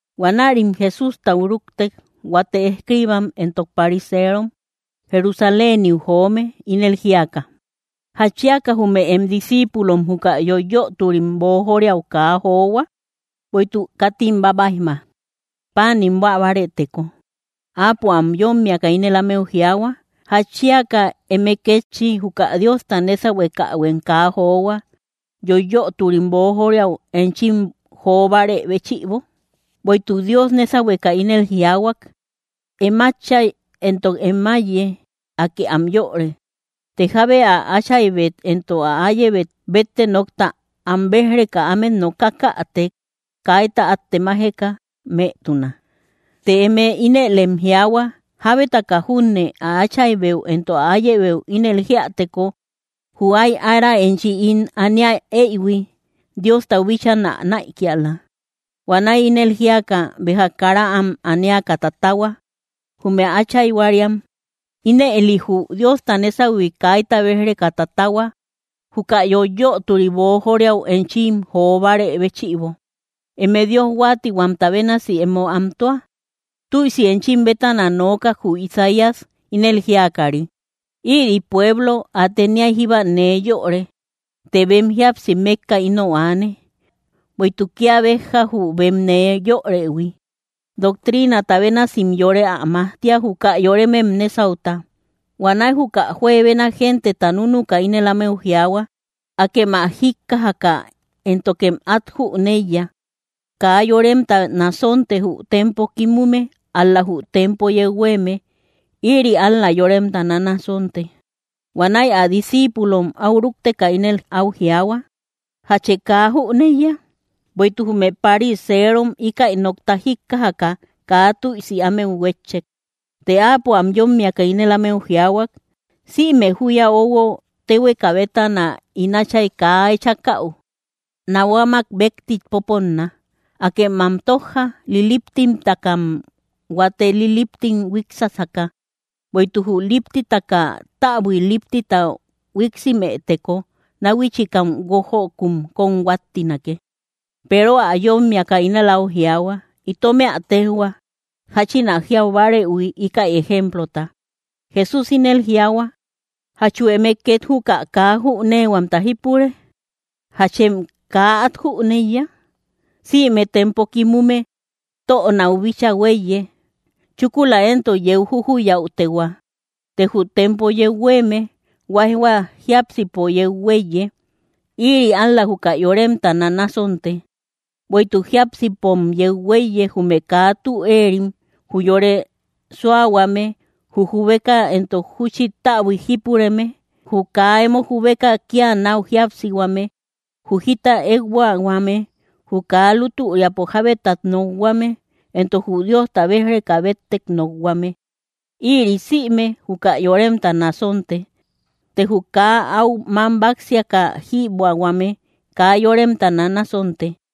Huanärim Jesústau rúktek, huate escriibam entok pariserom, Jerusaléniu joome, ínel jíaka: —¿Jatchiaka jume em discíipulom juka yoiyöturim boojoriau kaa johua? Bueïtuk katim bábaijma, páanim buä bárëteko. Áapo am yómmiaka ínel ámeu jiaahua: —¿Jatchiaka eme kétchi, juka Diosta nésahuekähuem kaa johua, yoiyöturim boojoriau enchim jo bárë béchïbo? Bueïtuk Dios nésahueka ínel jiaahuak: “Em átchay entok em áiye, Akë am yöre, të jábe ä áchaybet entok ä áyebet, bétte nokta am béj‑reka ámet nokakätek, kaita át temajeka mëtuna.” Të eme ínëlem jiaahua: “Jábetaka junne ä áchaybeu entok ä áyebeu ínel jíäteko, jü áy ára enchi ín aniä eyhui, Diostau bíchaa nä näikiala”, huanäi ínëli jíaka, béja kara am aniaka tatahua, jume áchayhuariam. Ínëli jü Diosta nésahui kaita béj‑reka tatahua, juka yoiyöturi boojoriau enchim jo bárë béchïbo. ¡Eme Dios huáatihuamta bénasi emo antua! Tüisi enchim bétana nookak jü Isaías, ínel jíakari: Ïri pueblo ä teniay jíba nee yöre, të bem jíapsi mékka inou aane. Bueïtuk kía béjja, jü bem nee yörëhui, doctriinata bénasim yore ä majtia, juka yoremem nésauta. Huanäi juka juebena genteta núnuka ínel ámeu jiaahua: —Akem ä jíkkajaka éntokem át jüneiya. Kaa yoremta nasonte, jü tempo kimume; ál‑la jü tempo yeu huéeme, ïri ál‑la yoremta nanasonte. Huanäi ä discíipulom áu rúkteka, ínel áu jiaahua: —¿Jachë kaa júneïya? Bueïtuk jume pariserom íkäi nokta jíkkajaka, kaa tüisi ámeu huétchek. Të Áapo am yómmiaka ínel ámeu jiaahuak: —Sïme júya óuhuo, téhueka bétana ín Áchay kaa echakäu, nahuamak békti popónna. ¡Akem am tójja! Liliptimtakam huate liliptim huíksasaka. Bueïtuk jü líptitaka täbui líptita huíksimëteko, náhuichikam guójökun kóm huáttinake. Peero ä yómmiaka ínel áu jiaahuak: —Itomë ä téjhua, jáchin ä jiau bárëhui, íkäi ejemplota. Jesús ínel jiaahua: —¿Jachu eme két juka kaa jüneehuamta jípure? ¿Jachem kaa át jüneiya? Sïme tempo kimume tönáu bíchaa huéiye; chúkula éntok yeu jujuyäutehua. Të jü tempo yeu huéeme, huáijhua jiápsipo yeu huéiye; ïri ál‑la juka yoremta nanasonte. Bueïtuk jiápsipom yeu huéiye, jume kaa tü éerim, jü yore suahuame, jü jubeka entok júchi täbuik jipureme, jü kaa emo jubeka kía náu jíapsihuame, jü jita ékbuahuame, jü kaa lútüriapo jábetat nokhuame, entok jü Diosta béj‑reka béttek nokhuame. Ïri sïme, juka yoremta nasonte; të jü kaa áu mám báksiaka jïbuähuame, kaa yoremta nanasonte.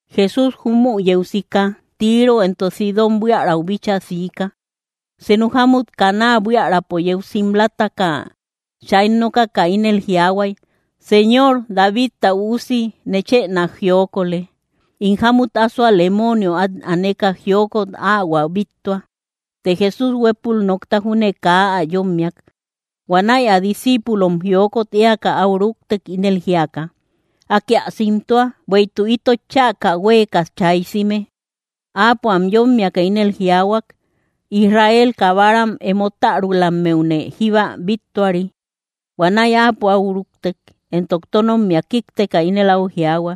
Jesús jumü yeu sika, Tiro entok Sidón buiärau bíchaa siika. Senu jámut Canaa buiärapo yeu simlataka, chay nokaka ínel jiaahuay: —¡Señor, Davidta Üusi, nechë nák jiokole! In jámut asoa lemoonio át aneka jiokot áhuä bíttua. Të Jesús huépul nokta júne kaa ä yómmiak. Huanäi ä discíipulom jiokot éaka áu rúktek, ínel jíaka: —Akë ä simtua, bueïtuk itot chäka huéeka chaysime. Áapo am yómmiaka ínel jiaahuak: —Israel kabaram emo tärulammeune jíba bíttuari. Huanäi áapo áu rúktek, entok tónommia kíkteka ínel áu jiaahua: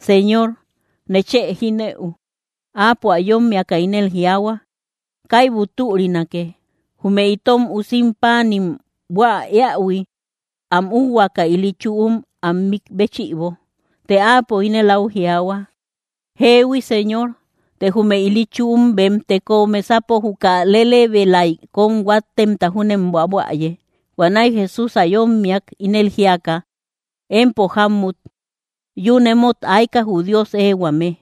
—¡Señor, nechë jinëu! Áapo ä yómmiaka ínel jiaahua: —Kaibu türinake, jume itom usim páanim buä éähui, am úuhuaka ili chüum am mik béchïbo. Të áapo ínel áu jiaahua: —Jeehui, Señor; të jume ili chüum bem teko mesapo juka lelebelaik kom huáttemta júnem buabuäye. Huanäi Jesús ä yómmiak, ínel jíaka: —Empo jámmut, ¡yún emót aika, jü Dios éehuame!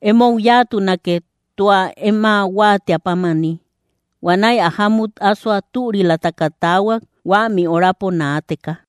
Emou yáatunake, tua em ä huáatiä pámani. Huanäi ä jámut ásoa türilataka taahuak, huämi orapo naateka.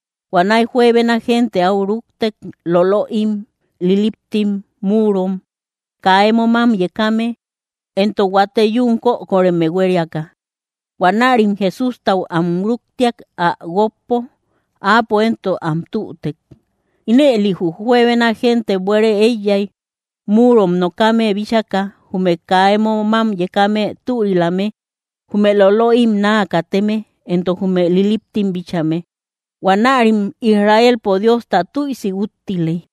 Huanäi juebena gente áu rúktek, lolöim, liliptim, múurom, kaa emo mám yekame, entok huate yún kökoreme huériaka. Huanärim Jesústau am rúktiak, ä guókpo. Áapo entok am tütek. Ínëli jü juebena gente buére éiyay, múurom nokame bíchaka, jume kaa emo mám yekame türilame, jume lolöim naa kateme, entok jume liliptim bíchame. Huanärim Israelpo Diosta tüisi úttiley.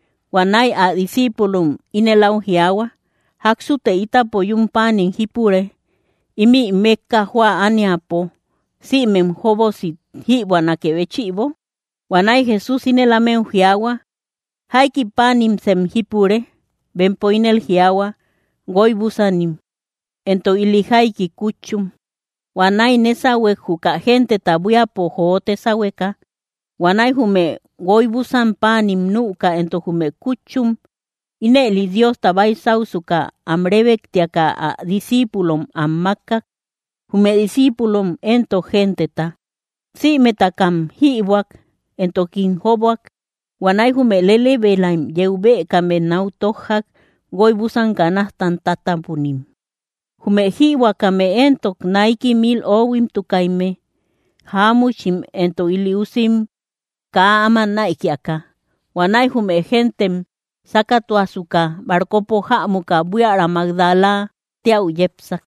Huanäi ä discíipulom ínel áu jiaahua: —¿Jáksute ítapo yún páanim jípure ímï mékka jóa ániapo, sïmem jóbosi jïbuänakre béchïbo? Huanäi Jesús ínel ámeu jiaahua: —¿Jaiki páanimsem jípure? Bempo ínel jiaahua: —Guoy búsanim, entok ili jaiki kútchum. Huanäi nésahuek, juka genteta buíapo jote sáhueka. Huanäi jume guoybusam páanim nüka entok jume kútchum, ínëli Diosta baysausuka, am rébektiaka ä discíipulom am mákkak; jume discíipulom éntok genteta. Sïmetakam jïbuäk, entokim jóbuak. Huanäi jume lelebelaim yeu bëkame náu tójjak, guoybusan canajtam tátapunim. Jume jïbuäkame éntok, naiki mil ohuimtukaimme, jáamuchim entok ili usim kaa áma näikiaka. Huanäi jume gentem sákatuasuka, barcopo jämuka buiära Magdala téäu yepsak.